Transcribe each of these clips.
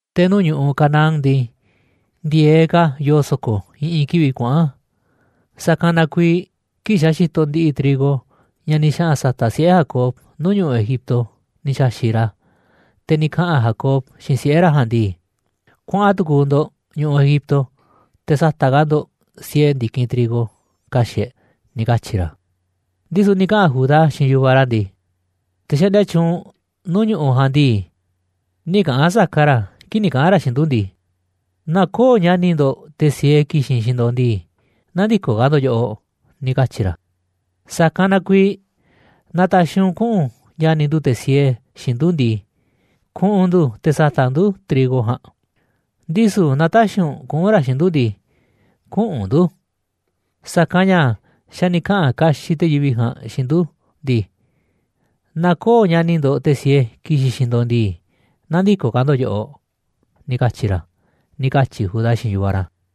Te̱ nuu̱ꞌ ñu̱ꞌuꞌ Canaán ndii, ndi̱e̱eꞌ ka̱ yoo so̱ko̱ i̱ꞌi̱n kivi̱ꞌ kuaꞌa̱n. Sa̱kanꞌ na kuiiꞌ kii̱ꞌ xa̱ xitoꞌ ndi̱ꞌi̱ trigo ña̱ ni̱ xaꞌa̱n sa̱ta̱ꞌ siꞌe̱ Jacob nuu̱ꞌ ñu̱ꞌuꞌ Egipto ni̱ xa̱xi̱ꞌ ra̱, te̱ ni̱ kaꞌa̱n Jacob xiinꞌ siꞌe̱ ra̱ ja̱a̱nꞌ ndii: ―Kuaꞌa̱n tu̱ku̱u̱ ndo̱ꞌ ñu̱ꞌuꞌ Egipto te̱ sa̱ta̱ꞌ ka̱ ndo̱ꞌ siee ndi̱kinꞌ trigo ka̱xi̱ꞌ e̱ꞌ ―ni̱ katyi̱ ra̱. Ndisu̱ ni̱ kaꞌa̱n Judá xiinꞌ yu̱vaꞌ ra̱ ndii: ―Te̱ xaꞌndia tyuunꞌ nuu̱ꞌ ñu̱ꞌuꞌ ja̱a̱nꞌ ndii, nï̱ kaꞌa̱n saka ra̱ kii̱ꞌ ni̱ kaꞌa̱n ra̱ xiinꞌ ndu̱ ndii: “Naaꞌ köo̱ꞌ ña̱ni̱ ndo̱ꞌ, te̱ siee, ki̱xi̱n xiinꞌ ndo̱ꞌ ndii, nä̱ndi̱koꞌ ka̱ ndo̱ꞌ yoꞌoꞌ”, ni̱ katyi̱ ra̱. Sa̱kanꞌ na kuiiꞌ naaꞌ ta̱xi̱ u̱nꞌ kuꞌu̱n ña̱ni̱ ndu̱ te̱ siee xiinꞌ ndu̱ ndii, kuꞌu̱n ndu̱ te̱ sa̱ta̱ꞌ ndu̱ trigo ja̱a̱nꞌ, ndisu̱ naaꞌ tä̱xi̱ u̱nꞌ kuꞌu̱n ra̱ xiinꞌ ndu̱ ndii, küꞌu̱n ndu̱. Sa̱kanꞌ ña̱ xa̱ ni̱ kaꞌa̱n kaxiꞌ te̱ yivi̱ꞌ ja̱a̱nꞌ xiinꞌ ndu̱ ndii: “Naaꞌ köo̱ꞌ ña̱ni̱ ndo̱ꞌ te̱ siee ki̱xi̱n xiinꞌ ndo̱ꞌ ndii, nä̱ndi̱koꞌ ka̱ ndo̱ꞌ yoꞌoꞌ”, ni̱ katyi̱ ra̱ ―ni̱ katyi̱ Judá xiinꞌ yu̱vaꞌ ra̱.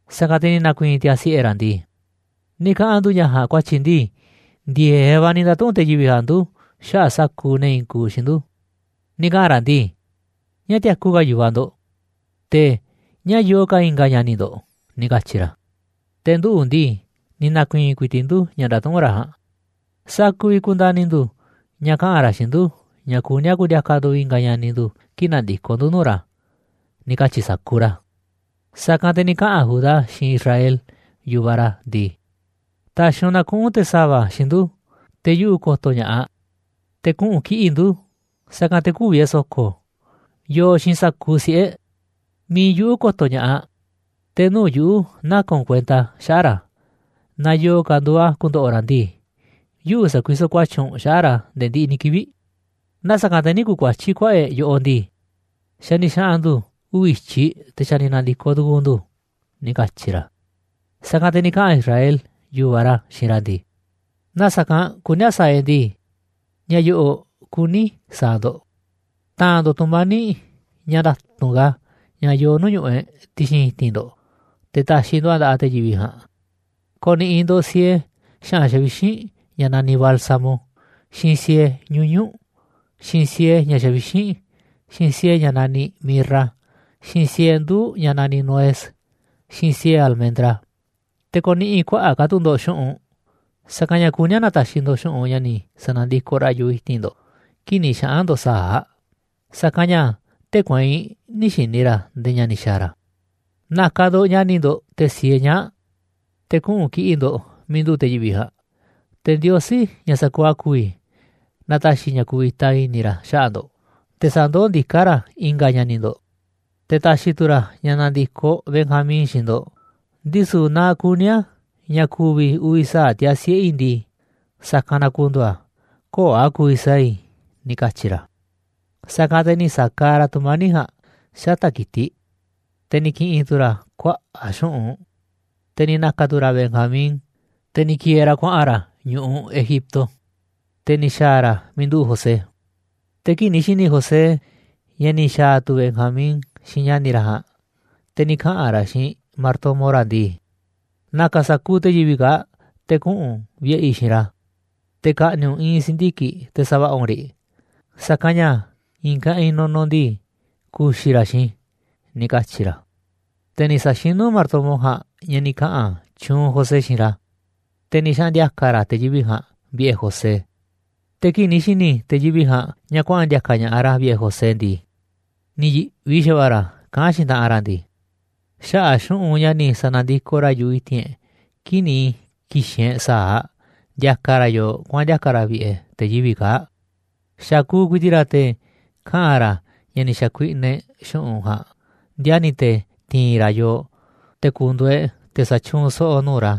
Sa̱kanꞌ te̱ ni̱ na̱ku̱i̱i̱n tiaa̱ siꞌe̱ ra̱ ndii: ―Ni̱ kaꞌa̱n ndu̱ ña̱ ja̱a̱nꞌ ku̱a̱tyi̱ ndii, ndi̱e̱eꞌ va̱ ni̱ nda̱tuꞌu̱nꞌ te̱ yivi̱ꞌ ja̱a̱nꞌ ndu̱ xaꞌa̱ꞌ sa̱kuuꞌ ne̱ i̱i̱n kuuꞌ xiinꞌ ndu̱. Ni̱ kaꞌa̱n ra̱ ndii: “¿Ñáá tiaku ka̱ yu̱vaꞌ ndo̱ꞌ? Te̱ ¿Ñáá yoo ka̱ i̱nga̱ ña̱ni̱ ndo̱ꞌ?”, ni̱ katyi̱ ra̱. Te̱ nduꞌu̱ ndii, ni̱ na̱ku̱i̱i̱n ku̱i̱ti̱ꞌ ndu̱ ña̱ ndatuꞌúnꞌ ra̱ ja̱a̱nꞌ, ¿sa̱a̱ ku̱vi̱ ku̱nda̱ni̱ ndu̱ ña̱ kaꞌa̱n ra̱ xiinꞌ ndu̱ ña̱ kuní a̱ ku̱ndi̱a̱ka̱ ndu̱ i̱nga̱ ña̱ni̱ ndu̱ kii̱ꞌ na̱ndi̱koꞌ ndu̱ nuu̱ꞌ ra̱? ―ni̱ katyi̱ sa̱kuuꞌ ra̱. Sa̱kanꞌ te̱ ni̱ kaꞌa̱n Judá xiinꞌ Israel, yu̱vaꞌ ra̱, ndii: ―Ta̱xi̱ u̱nꞌ na kuꞌu̱n te̱ sa̱va̱ xiinꞌ ndu̱ te̱ yuꞌu̱ ko̱to̱ ña̱ꞌaꞌ, te̱ kuꞌu̱n kiꞌi̱ꞌ ndu̱, sa̱kanꞌ te̱ kü̱vi̱ e̱ꞌ so̱ko̱, yooꞌ xiinꞌ sa̱kuuꞌ siꞌe̱ e̱ꞌ. Mi̱iꞌ yuꞌu̱ ko̱to̱ ña̱ꞌaꞌ, te̱ nuu̱ꞌ yuꞌu̱ naka̱n u̱nꞌ kuenta xaꞌa̱ꞌ ra̱. Naaꞌ yo̱o̱ ka̱ nduuꞌ a̱ ku̱ndo̱ꞌo̱ ra̱ ndii, yuꞌu̱ sa̱kuisoꞌ ku̱a̱tyi̱ u̱nꞌ xaꞌa̱ꞌ ra̱ nde̱e̱ ndiꞌiꞌ ni̱ kivi̱ꞌ. Naaꞌ sa̱kanꞌ te̱ nï̱ ku̱kuatyí kuaꞌa̱ꞌ e̱ꞌ yoꞌoꞌ ndii, xa̱ ni̱ xaꞌa̱n ndu̱ uvi̱ i̱tyiꞌ te̱ xa̱ ni̱ na̱ndi̱koꞌ tu̱ku̱u̱ ndu̱ ―ni̱ katyi̱ ra̱. Sa̱kanꞌ te̱ ni̱ kaꞌa̱n Israel, yu̱vaꞌ ra̱, xiinꞌ ra̱ ndii: ―Naaꞌ sa̱kanꞌ kuní a̱ sa̱a̱ e̱ꞌ ndii, ña̱ yo̱ꞌo̱ kuní i̱ sa̱a̱ ndo̱ꞌ. Ta̱a̱nꞌ ndo̱ꞌ tu̱mani̱ꞌ ña̱ nda̱tu̱nꞌ ka̱ ña̱ yoo nuu̱ꞌ ñu̱ꞌuꞌ e̱ꞌ ti̱xi̱n i̱ti̱n ndo̱ꞌ te̱ ta̱xi̱ ndo̱ꞌ a̱ nda̱ꞌaꞌ te̱ yivi̱ꞌ ja̱a̱nꞌ. Ko̱ni̱ꞌi̱ ndo̱ꞌ siee xa̱ꞌa̱n xavixínꞌ ña̱ naniꞌ bálsamo, xiinꞌ siee ñuñu̱ꞌ, xiinꞌ siee ña̱ xavixínꞌ, xiinꞌ siee ña̱ naniꞌ mirra, xiinꞌ siee nduu̱ꞌ ña̱ naniꞌ nuez, xiinꞌ siee almendra. Te̱ ko̱ni̱ꞌi̱ kuaꞌa̱ꞌ ka̱ tu̱ ndo̱ꞌ xu̱ꞌunꞌ, sa̱kanꞌ ña̱ kuní a̱ na̱ta̱xi̱ ndo̱ꞌ xu̱ꞌunꞌ ña̱ ni̱ sa̱na̱ndikoꞌ ra̱ yu̱ꞌuꞌ i̱ti̱n ndo̱ꞌ kii̱ꞌ ni̱ xaꞌa̱n ndo̱ꞌ sa̱aꞌ, sa̱kanꞌ ña̱ tee̱ꞌ kueinꞌ nï̱ xi̱ni̱ ra̱ ndee ña̱ ni̱ xa̱a̱ ra̱. Na̱ka̱ ndo̱ꞌ ña̱ni̱ ndo̱ꞌ, te̱ siee ñaa̱ꞌ, te̱ kuꞌu̱n kiꞌi̱ꞌ ndo̱ꞌ miiꞌ nduꞌu̱ꞌ te̱ yivi̱ꞌ ja̱a̱nꞌ. Te̱ Ndiosí, ña̱ sa̱kuuꞌ a̱ ku̱vi̱, na ta̱xi̱ ña̱ ku̱vi̱ta i̱ni̱ ra̱ xaꞌa̱ꞌ ndo̱ꞌ te̱ sa̱ndoó ndiká ra̱ i̱nga̱ ña̱ni̱ ndo̱ꞌ, te̱ ta̱xi̱ tu̱ ra̱ ña̱ na̱ndi̱koꞌ Benjamín xiinꞌ ndo̱ꞌ. Ndisu̱ naaꞌ kuní a̱ ña̱ ku̱vi̱ uvi̱ sa̱aꞌ tiaa̱ siꞌe̱ i̱ ndii, sa̱kanꞌ na ku̱ndu̱u̱ a̱, köo̱ꞌ a̱ ku̱vi̱ sa̱a̱ i̱ ―ni̱ katyi̱ ra̱. Sa̱kanꞌ te̱ ni̱ sa̱kaaꞌ ra̱ tu̱mani̱ꞌ ja̱a̱nꞌ xata̱ꞌ ki̱tiꞌ, te̱ ni̱ ki̱ꞌi̱n tu̱ ra̱ kuaꞌa̱ꞌ xu̱ꞌunꞌ, te̱ ni̱ na̱ka̱ tu̱ ra̱ Benjamín, te̱ ni̱ ki̱e̱e̱ ra̱ kuaꞌa̱n ra̱ ñu̱ꞌuꞌ Egipto. Te̱ ni̱ xa̱a̱ ra̱ miiꞌ nduꞌu̱ꞌ José. Te̱ kii̱ꞌ ni̱ xi̱ni̱ José ña̱ ni̱ xa̱a̱ tu̱ Benjamín xiinꞌ ña̱ni̱ ra̱ ja̱a̱nꞌ, te̱ ni̱ kaꞌa̱n ra̱ xiinꞌ martomo ra̱ ndii: ―Na̱ka̱ sa̱kuuꞌ te̱ yivi̱ꞌ kaa̱ꞌ te̱ kuꞌu̱n u̱nꞌ vi̱ꞌe̱ i̱ xiinꞌ ra̱, te̱ ka̱ꞌni̱ꞌ u̱nꞌ i̱i̱n si̱ndiki̱ꞌ te̱ sa̱va̱ꞌa̱ u̱nꞌ riꞌ, sa̱kanꞌ ña̱ i̱i̱n kaꞌinꞌ nunuꞌ ndii, ku̱xi̱ ra̱ xiinꞌ i̱ ―ni̱ katyi̱ ra̱. Te̱ ni̱ sa̱xinú martomo ja̱a̱nꞌ ña̱ ni̱ kaꞌa̱n tyuunꞌ José xiinꞌ ra̱, te̱ ni̱ xaꞌa̱n ndi̱a̱ka̱ ra̱ te̱ yivi̱ꞌ ja̱a̱nꞌ vi̱ꞌe̱ José. Te̱ kii̱ꞌ ni̱ xi̱ni̱ te̱ yivi̱ꞌ ja̱a̱nꞌ ña̱ kuaꞌa̱n ndi̱a̱ka̱ ña̱ꞌaꞌ ra̱ vi̱ꞌe̱ José ndii, ni̱ yi̱ꞌvi xa̱va̱ꞌa̱ ra̱ kaꞌán xiinꞌ taꞌanꞌ ra̱ ndii: ―Xaꞌa̱ꞌ xu̱ꞌunꞌ ña̱ ni̱ sa̱na̱ndikoꞌ ra̱ yu̱ꞌuꞌ i̱ti̱n e̱ꞌ kii̱ꞌ ni̱ ki̱xi̱n e̱ꞌ sa̱aꞌ ndiakaꞌ ra̱ yooꞌ kuaꞌa̱n ndi̱a̱ka̱ ra̱ vi̱ꞌe̱ te̱ yivi̱ꞌ kaa̱ꞌ, xakuuꞌ ku̱i̱ti̱ꞌ ra̱ te̱ kaꞌa̱n ra̱ ña̱ ni̱ xa̱kuiꞌnaꞌ e̱ꞌ xu̱ꞌunꞌ ja̱a̱nꞌ ndiani̱ te̱ ti̱i̱n ra̱ yooꞌ te̱ ku̱ndu̱u̱ e̱ꞌ te̱ sa̱tyuunꞌ so̱ꞌo̱ nuu̱ꞌ ra̱,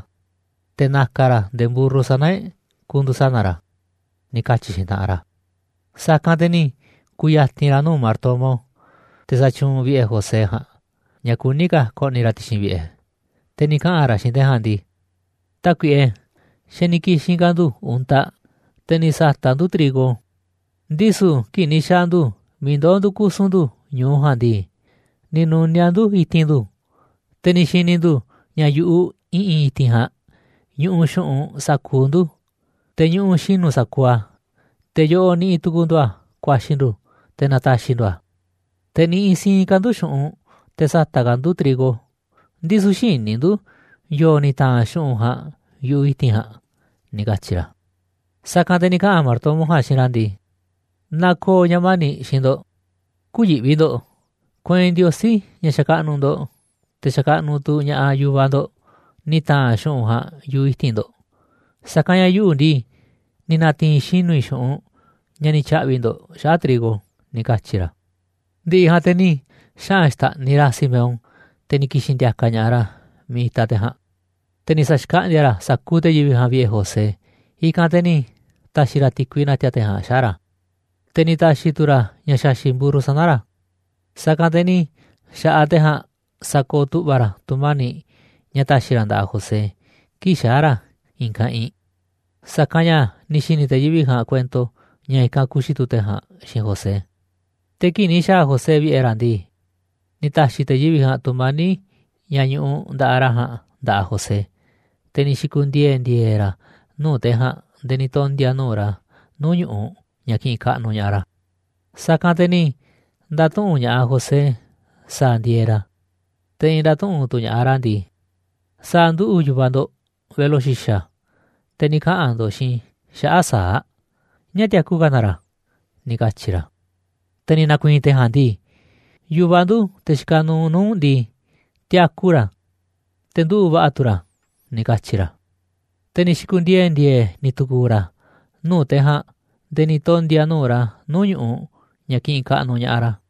te̱ na̱ka̱ ra̱ nde̱e̱ mburru sana̱ e̱ꞌ ku̱ndu̱u̱ sana̱ ra̱ ―ni̱ katyi̱ xiinꞌ taꞌanꞌ ra̱. Sa̱kanꞌ te̱ ni̱ ku̱ya̱ti̱n ra̱ nuu̱ꞌ martomo, te̱ xatyuunꞌ vi̱ꞌe̱ José ja̱a̱nꞌ, ña̱ kuní ka̱ ko̱ꞌni̱ ra̱ ti̱xi̱n vi̱ꞌe̱, te̱ ni̱ kaꞌa̱n ra̱ xiinꞌ te̱ ja̱a̱nꞌ ndii: ―Tákuiꞌe, xa̱ ni̱ ki̱xi̱n ka̱ ndu̱ untaꞌ, te̱ ni̱ sa̱ta̱ꞌ ndu̱ trigo, ndisu̱ kii̱ꞌ ni̱ xaa̱ ndu̱ miiꞌ ndoo̱ ndu̱ kusu̱n ndu̱ ñu̱u ja̱a̱nꞌ ndii, ni̱ nu̱niaꞌ ndu̱ i̱ti̱n ndu̱, te̱ ni̱ xi̱ni̱ ndu̱ ña̱ yu̱ꞌuꞌ i̱ꞌi̱n i̱ti̱n ja̱a̱nꞌ ñuꞌuꞌ xu̱ꞌunꞌ sa̱kuuꞌ ndu̱, te̱ ñuꞌuꞌ xinu̱ sa̱kuuꞌ a̱, te̱ yoꞌoꞌ niꞌiꞌ tu̱ku̱u̱ ndu̱ a̱ ku̱a̱xi̱ ndu̱ te̱ na̱ta̱xi̱ ndu̱ a̱. Te̱ niꞌiꞌ siinꞌ ka̱ ndu̱ xu̱ꞌunꞌ te̱ sa̱ta̱ꞌ ka̱ ndu̱ trigo, ndisu̱ xïní ndu̱ yo̱o̱ ni̱ ta̱a̱nꞌ xu̱ꞌunꞌ ja̱a̱nꞌ yu̱ꞌuꞌ i̱ti̱n ja̱a̱nꞌ ―ni̱ katyi̱ ra̱. Sa̱kanꞌ te̱ ni̱ kaꞌa̱n martomo ja̱a̱nꞌ xiinꞌ ra̱ ndii: ―Na ko̱o̱ ña̱ mani̱ꞌ xiinꞌ ndo̱ꞌ, kü̱yi̱ꞌvi ndo̱ꞌ. Kueinꞌ Ndiosí, ña̱ xakaꞌnuꞌ ndo̱ꞌ, te̱ xakaꞌnuꞌ tu̱ ña̱ꞌaꞌ yu̱vaꞌ ndo̱ꞌ, ni̱ ta̱a̱nꞌ xu̱ꞌunꞌ ja̱a̱nꞌ yu̱ꞌuꞌ i̱ti̱n ndo̱ꞌ, sa̱kanꞌ ña̱ yuꞌu̱ ndii, ni̱ na̱ti̱i̱n xinu̱ i̱ xu̱ꞌunꞌ ña̱ ni̱ tya̱ꞌvi̱ ndo̱ꞌ xaꞌa̱ꞌ trigo ―ni̱ katyi̱ ra̱. Ndi̱ꞌi̱ ja̱a̱nꞌ te̱ ni̱ xaꞌa̱n xta̱ꞌniꞌ ra̱ Simeón, te̱ ni̱ ki̱xi̱n ndi̱a̱ka̱ ña̱ꞌaꞌ ra̱ miiꞌ itaꞌ te̱ ja̱a̱nꞌ. Te̱ ni̱ sa̱xkaꞌndi̱a̱ ra̱ sa̱kuuꞌ te̱ yivi̱ꞌ ja̱a̱nꞌ vi̱ꞌe̱ José, i̱kanꞌ te̱ ni̱ ta̱xi̱ ra̱ ti̱kui na̱ti̱a̱ te̱ ja̱a̱nꞌ xaꞌa̱ꞌ ra̱, te̱ ni̱ ta̱xi̱ tu̱ ra̱ ña̱ xa̱xi̱ꞌ mburru sana̱ ra̱. Sa̱kanꞌ te̱ ni̱ xa̱ꞌaꞌ te̱ ja̱a̱nꞌ sakooꞌ tu̱ꞌva̱ ra̱ tu̱mani̱ꞌ ña̱ ta̱xi̱ ra̱ nda̱ꞌaꞌ José kii̱ꞌ xaa̱ ra̱ i̱i̱n kaꞌinꞌ, sa̱kanꞌ ña̱ ni̱ xi̱ni̱ te̱ yivi̱ꞌ ja̱a̱nꞌ kuento ña̱ i̱kanꞌ ku̱xi̱ tu̱ te̱ ja̱a̱nꞌ xiinꞌ José. Te̱ kii̱ꞌ ni̱ xa̱a̱ José vi̱ꞌe̱ ra̱ ndii, ni̱ ta̱xi̱ te̱ yivi̱ꞌ ja̱a̱nꞌ tu̱mani̱ꞌ, ña̱ ñuꞌuꞌ nda̱ꞌaꞌ ra̱ ja̱a̱nꞌ, nda̱ꞌaꞌ José, te̱ ni̱ xi̱ku̱ndiee̱ ndi̱e̱e̱ ra̱ nuu̱ꞌ te̱ ja̱a̱nꞌ nde̱e̱ ni̱ tondi̱a̱ nuu̱ꞌ ra̱ nuu̱ꞌ ñu̱ꞌuꞌ ña̱ kiꞌinꞌ kaꞌnuꞌ ña̱ꞌaꞌ ra̱. Sa̱kanꞌ te̱ ni̱ nda̱tuꞌu̱nꞌ ña̱ꞌaꞌ José sa̱a̱ ndieeꞌ ra̱. Te̱ ni̱ nda̱tuꞌu̱nꞌ tu̱ ña̱ꞌaꞌ ra̱ ndii: ―¿Sa̱a̱ nduꞌu̱ꞌ yu̱vaꞌ ndo̱ꞌ, velo xi̱xa̱, te̱ ni̱ kaꞌa̱n ndo̱ꞌ xiinꞌ i̱ xaꞌa̱ꞌ sa̱aꞌ? ¿Ñáá tiaku ka̱ na ra̱? ―ni̱ katyi̱ ra̱. Te̱ ni̱ na̱ku̱i̱i̱n te̱ ja̱a̱nꞌ ndii: ―Yu̱vaꞌ ndu̱, te̱ xikaꞌ nuuꞌ nuu̱ꞌ u̱nꞌ ndii, tiaku ra̱, te̱ nduꞌu̱ꞌ va̱ꞌa̱ tu̱ ra̱ ―ni̱ katyi̱ ra̱. Te̱ ni̱ xi̱ku̱ndiee̱ ndi̱e̱e̱ ni̱ tu̱ku̱u̱ ra̱ nuu̱ꞌ te̱ ja̱a̱nꞌ nde̱e̱ ni̱ tondi̱a̱ nuu̱ꞌ ra̱ nuu̱ꞌ ñu̱ꞌuꞌ ña̱ kiꞌinꞌ kaꞌnuꞌ ña̱ꞌaꞌ ra̱.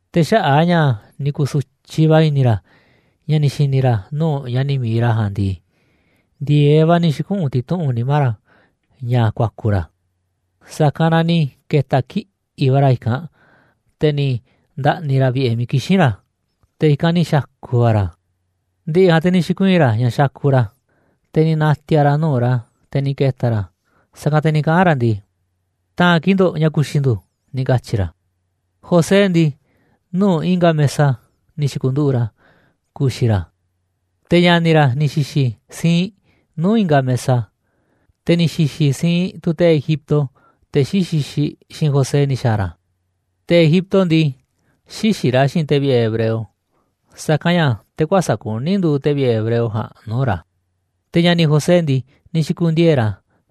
Te̱ xaꞌa̱ꞌ a̱ ña̱ ni̱ ku̱su̱tyiꞌ va̱ i̱ni̱ ra̱ ña̱ ni̱ xi̱ni̱ ra̱ nuu̱ꞌ ña̱ni̱ mi̱iꞌ ra̱ ja̱a̱nꞌ ndii, ndi̱e̱eꞌ va̱ ni̱ xi̱kuꞌu̱n ti̱tuꞌu̱nꞌ nimá ra̱ ña̱ ku̱a̱ku̱ ra̱, sa̱kanꞌ na ni̱ ke̱ta̱ kiꞌi̱ꞌ va̱ ra̱ i̱kanꞌ, te̱ ni̱ nda̱ꞌni̱ ra̱ vi̱ꞌe̱ miiꞌ kixín ra̱, te̱ i̱kanꞌ ni̱ xa̱ku̱ va̱ ra̱. Ndi̱ꞌi̱ ja̱a̱nꞌ te̱ ni̱ xi̱kuii̱n ra̱ ña̱ xakuꞌ ra̱, te̱ ni̱ na̱ti̱a̱ ra̱ nuu̱ꞌ ra̱, te̱ ni̱ ke̱ta̱ ra̱, sa̱kanꞌ te̱ ni̱ kaꞌa̱n ra̱ ndii: ―Ta̱a̱nꞌ kii̱ꞌ ndo̱ꞌ ña̱ ku̱xi̱ ndu̱ ―ni̱ katyi̱ ra̱. José ndii, nuu̱ꞌ i̱nga̱ mesa ni̱ xi̱ku̱nduꞌu̱ꞌ ra̱ ku̱xi̱ ra̱, te̱ ña̱ni̱ ra̱ ni̱ xi̱xi̱ siinꞌ nuu̱ꞌ i̱nga̱ mesa, te̱ ni̱ xi̱xi̱ siinꞌ tu̱ te̱ Egipto, te̱ xí xixiꞌ xiinꞌ José ni̱ xa̱a̱ ra̱. Te̱ Egipto ndii, xïxiꞌ ra̱ xiinꞌ te̱ vi̱ꞌe̱ hebreo, sa̱kanꞌ ña̱ te̱ kuäsa̱ꞌ kuní nduuꞌ te̱ vi̱ꞌe̱ hebreo ja̱a̱nꞌ nuu̱ꞌ ra̱. Te̱ ña̱ni̱ José ndii, ni̱ xi̱ku̱ndiee̱ ra̱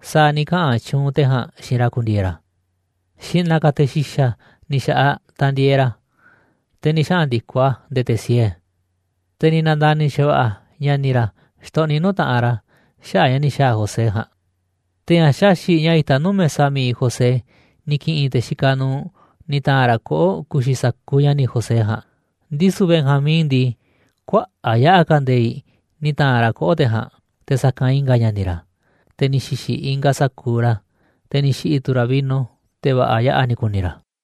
sa̱a̱ ni̱ kaꞌa̱n tyuunꞌ te̱ ja̱a̱nꞌ xiinꞌ ra̱ ku̱ndi̱e̱e̱ ra̱, xi̱ꞌna̱ ka̱ te̱ xi̱xa̱ ni̱ xa̱ꞌaꞌ tandieeꞌ ra̱, te̱ ni̱ xaꞌa̱n ndi̱koꞌ a̱ nde̱e̱ te̱ siee. Te̱ ni̱ na̱nda̱ni̱ xa̱va̱ꞌa̱ ña̱ni̱ ra̱ xtoꞌniꞌ nuu̱ꞌ taꞌanꞌ ra̱ xaꞌa̱ꞌ ña̱ ni̱ xa̱a̱ José ja̱a̱nꞌ. Te̱ ña̱ xaxi̱ꞌ ña̱ itaꞌ nuu̱ꞌ mesa mi̱iꞌ José ni̱ ki̱ꞌi̱n te̱ xikaꞌ nuuꞌ ni̱ ta̱a̱nꞌ ra̱ koꞌo̱ꞌ ku̱xi̱ sa̱kuuꞌ ña̱ni̱ José ja̱a̱nꞌ, ndisu̱ Benjamín ndii, kuaꞌa̱ꞌ yaꞌa̱ ka̱ nde̱i̱ꞌ ni̱ ta̱a̱nꞌ ra̱ koꞌo̱ꞌ te̱ ja̱a̱nꞌ te̱ sa̱kanꞌ i̱nga̱ ña̱ni̱ ra̱. Te̱ ni̱ xi̱xi̱ ingaꞌ sa̱kuuꞌ ra̱, te̱ ni̱ xi̱ꞌi̱ tu̱ ra̱ vino, te̱ va̱ꞌa̱ yaꞌa̱ ni̱ ku̱ni̱ ra̱.